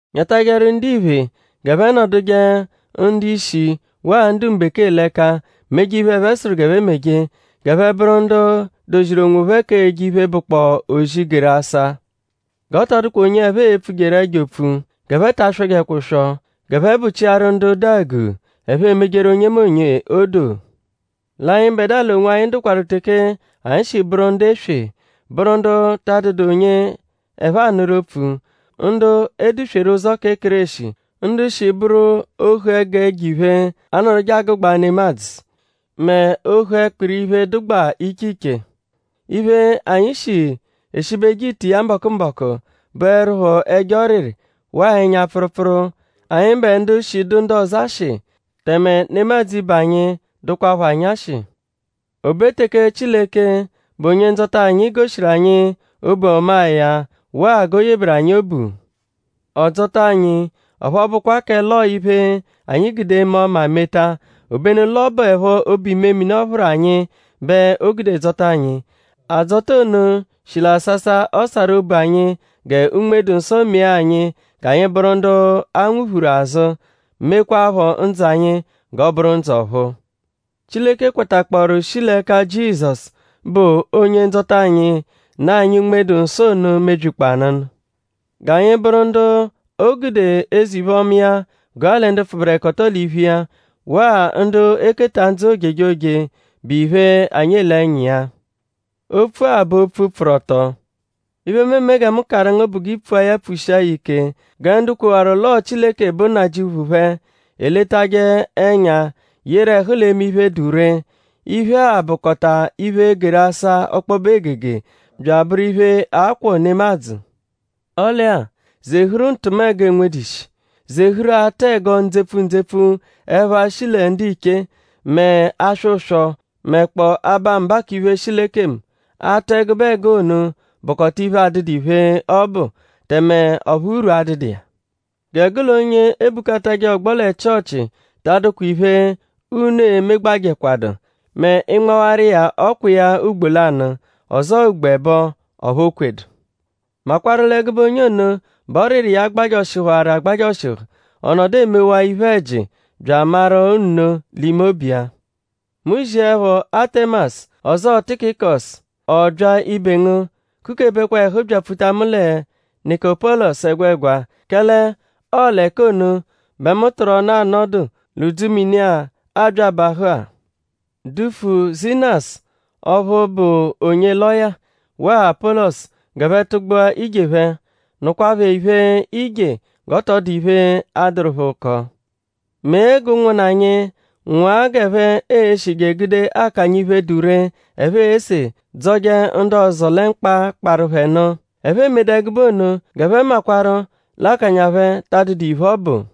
Nyatajẹru ndiphe g'ẹphe nọduje ndu-ishi waa ndu-mbekee l'ẹka; meje iphe, ẹphe sụru g'e meje; g'ẹphe bụru ndu doziru onwophẹ k'eje iphe, bụkpoo ozi, geru asa. G'ọ tọ dụkwa onye ẹphe e-pfujeru ẹjo opfu; g'ẹphe ta aswọjekwa ụswo; g'ẹphe bụchiaru ndu dụ àgù; ẹphe emejeru onyemonye odoo. L'anyịbedua l'onwanyi dụkwaru teke anyi shi bụru ndu eswe; bụru ndu ta adụdu onye ẹphe anụru opfu; ndu e dusweru ụzo kẹ Kéreshi; ndu shi bụru ohu ẹgu ẹjo-iphe, anọduje agụgbaa nemadzụ mẹ ohu ẹkpiri iphe, dụgbaa iche iche. Iphe, anyi shi eshibeje ite iya mbọku-mbọku bụerupho ẹjo ọriri waa ẹnya-pfụrupfuru; anyịbe ndu shi dụ ndu ọzo ashị; tẹme nemadzụ ibe anyi dụkwapho anyi ashị. O be teke Chileke, bụ Onye-Ndzọta anyi goshiru anyi obu ọmaa ya waa g'o yeberu anyi obu; ọ dzọta anyi; ọphu ọ bụkwa kẹ l'ọo iphe, anyi gude eme ọma meta; obenu l'ọ bụepho obu-imemini, ọ phụru anyi bẹ o gude dzọta anyi. Adzọta ono shi l'asasa, ọ sarụ obu anyi gẹ Unme-dụ-Nsọ mee anyi g'anyi bụru ndu a nwuphuru azụ; mekwaaphọ ndzụ anyi g'ọ bụru ndzụ ọ̀phúú. Chileke kwatakpọoru shi l'ẹka Jizọsu, bụ Onye-Ndzọta anyi; nụ anyi Unme-dụ-Nsọ ono mebyikpọo anụnu; g'anyi bụru ndu o gude eze-iphe-ọma iya gụa lẹ ndu pfụberekoto l'iphu iya; waa ndu e-keta ndzụ ojejoje, bụ iphe, anyi ele ẹnya iya. Opfu-a bụ opfu, pfụru ọto. Iphe, mu eme gẹ mu karụ ngu bụ g'i pfua ya pfushia ya ike gẹ ndu kwewaru l'ọo Chileke bụ Nnajịuphu phẹ eletajẹ ẹnya yeru ẹhu l'eme iphe, dụ ree. Iphe-a bụkota iphe, geru asa ọkpobe egege bya abụru iphe, a-kwọ nemadzụ. Ọle-a; zehuru ntụmego, enwedu ishi; zehuru atụ ẹgo ndzepfu ndzepfu ẹpha, shi lẹ ndiche; mẹ aswọ ụswo; mẹkpoo aba mba k'iphe shi l'ekemu. Atụ ẹgube ẹgo ono bụkota iphe, adụdu iphe, ọ bụ; tẹme ọphu urwu adụdu iya. Gẹ gụ l'onye ebukatajẹ ọgbo lẹ Chịochi ta adụkwa iphe, unu e-megbajẹkwadu mẹ ị -nmawaru iya ọkwa iya ugbo lanụ; ọzoo ugbo ẹbo; ọphu o kwedu. Makwarụ l'ẹgube onye ono bẹ ọriri iya gbajọshihuwaru agbajọshihu; ọ nọdu emewaa iphe-ẹji bya amaru nno l'ime obu iya. Mu -ziẹpho Atẹmasu; ọzoo Tikikọsu; ọ bya ibe ngu; kukebekwa ẹhu byapfuta mu lẹ Nịkopolisu ẹgwegwa; kẹle ọo l'ẹka ono bẹ mu tụru ọnu anọdu l'udzumini-a, aabya abahụ-a. Dufu Zinasu ọphu bụ onye lọya; waa Apọlosu g'ẹphe tụgbua ije phẹ. Nụkwa phẹ iphe-ije g'ọ tọ dụ iphe, a-dụru phẹ ụko. Mee g'ụnwunna anyi nwụa g'ẹphe e-shije gude akanya iphe, dụ ree, ẹphe ese dzọje ndu ọzo lẹ mkpa, kparụ phẹ nụ. Ẹphe 'emedu ẹgube ono g'ẹphe makwarụ l'akanya phẹ ta adụdu iphe, ọ bụ.